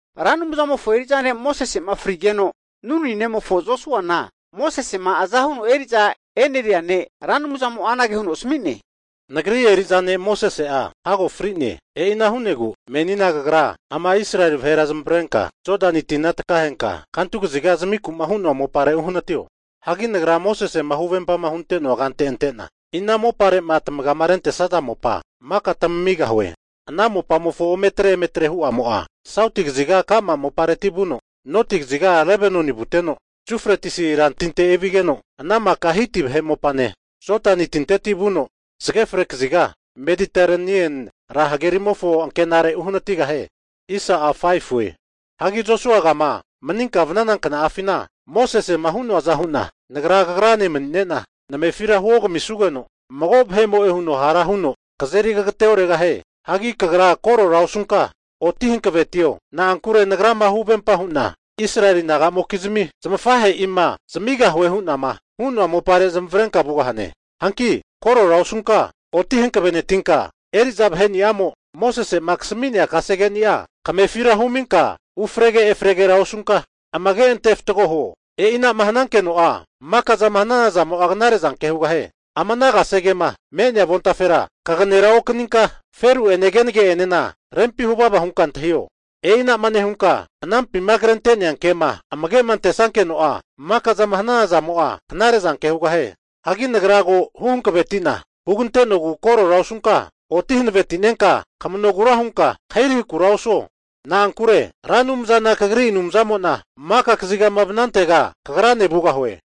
Ra Anumzamofo eri'za ne' Mosese'ma frigeno, Nuni nemofo Josuana Mosesema aza huno eri'za e'neria ne' Ra Anumzamo'a anage huno asami'ne. Nagri eri'za ne' Mosese'a hago fri'ne. E'ina hu'negu menina kagra ama Israeli vahera zamavarenka Jodani tina takaheta kantu kaziga zamiku'ma hu'noa mopare uhanatiho. Hagi Nagra Mosese'ma huvempama hunte'noa kante ante'na, ina mopare'ma tamagiama rentesaza mopa maka tamamigahue. Ana mopamofo ometre emetre hu'amo'a, sauti kaziga ka'ma mopareti vuno, noti kaziga Lebanoni vuteno, Yufretisi rantinte evanigeno, ana maka Hiti vahe mopane, Jodani tinteti vuno zage fre kaziga Mediterenieni ra hagerimofo ankenare uhanatigahie. Hagi Josuagama maninka vanana kna'afina, Mosesema hu'noaza hu'na Nagra kagrane mani'ne'na namefira huogamisugeno, mago vahe'mo'e huno hara huno kazeri kageteoregahie. Hagi kagra korora osunka oti hanavetio, na'ankure Nagrama huvempa hu'na Israeli naga'mokizmi zamafahe'ima zamigahue hu'nama hu'noa mopare zamavarenka vugahane. Hanki korora osunka oti hankavenentinka, eri'za vaheni'amo Mosese'ma kasami'nea kasegeni'a kamefira huminka ufrege efregera osunka, amege ante fatgo huo. E'inama hanankeno'a, maka zama hanana zamo'a knare'zanke hugahie. Ama ana kasegema me'nea avontafera kagenera okaninka, feru'ene kenege'enena rempi huvava hunka antahio. E'inama nehunka anampima krente'nea kema amage antesankeno'a, maka'zama hanana zamo'a knare'zanke hugahie. Hagi Nagra ko' huhankaveti'na hugante'nogu korora osunka oti hanaveti'nenka, kamanogura hunka kahirahikura osuo. Na'ankure Ra Anumzana kagri Anumzamo'na maka kazigama vanantega kagrane vugahue.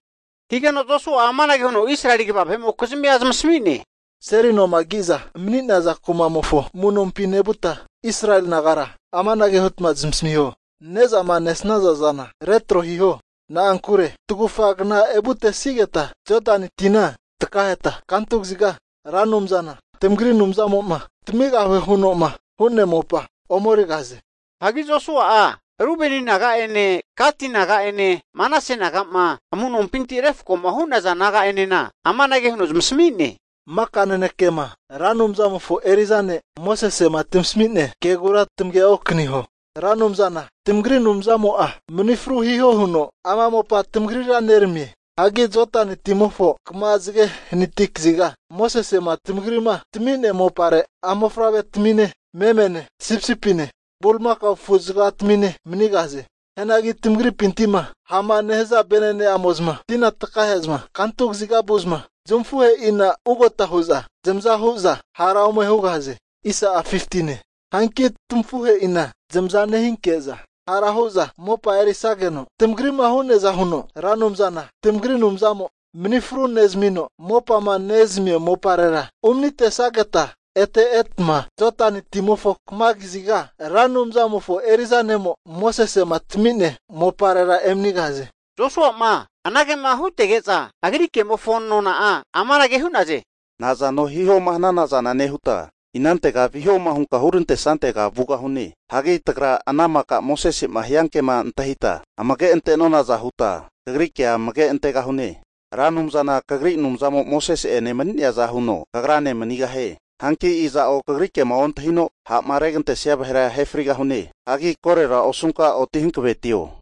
Higeno Josua'a amanage huno Israeli kva vahe'mokizmia zamasami'ne, Seli noma ki'za mani'naza kuma'mofo amu'nompi nevuta, Israeli nagara amanage hutma zamasamiho. Ne'zama nesaza zana retro hiho. Na'ankure tagufa kna evutesigeta Jodani tina takaheta kantu kaziga Ra Anumzana tamagri Anumzamo'ma tamigahue huno'ma hu'nea mopa ome erigahaze. Hagi Josua'a Rubeni naga'ene Gati naga'ene, Manase naga'ma amu'nompinti refkoma hu'naza naga'enena amanage huno zamasmi'ne, Maka nanekema Ra Anumzamofo eri'za ne' Mosese'ma tamasami'nea kegura tamagera okaniho. Ra Anumzana tamagri Anumzamo'a mani fru hiho huno ama mopa tamagrira neramie. Hagi Jodani timofo kama zage hanati kaziga Mosese'ma tamagri'ma tami'nea mopare a' mofavre'tamine, memene sipisipine bulimakao afuzagatamine manigahaze. Hianagi tamagripinti'ma ha'ma nehaza vene'ne'amo'za tina takahe'zma kantu kaziga vu'za, zamafuhe'ina ugota hu'za zamazahu'za hara ome hugahaze. Hanki tamafuhe'ina zamaza nehinke'za hara hu'za mopa erisageno, tamagri'ma hu'neaza huno Ra Anumzana tamagri Anumzamo mani fru nezamino mopama nezamia moparera umanitesageta, ete etma Jodani timofo kama kaziga Ra Anumzamofo eri'za ne'mo Mosese'ma tami'nea moparera emanigahaze. Josua'ma anagema hutege'za, agri kemofo nona'a amanage hu'naze, nazano hihoma hunka hana zana nehuta, inantego vihoma hunka hurantesantega vugahune. Hagi tagra ana maka Mosese'ma hiankema antahita amage ante'nonaza huta, kagri kea amage antegahune. Ra Anumzana kagri Anumzamo Mosese'ene mani'neaza huno kagrane manigahie. Hanki iza'o kagri kema ontahino ha'ma regantesia vahera ahe frigahune. Hagi korera osunka, oti hankavetio.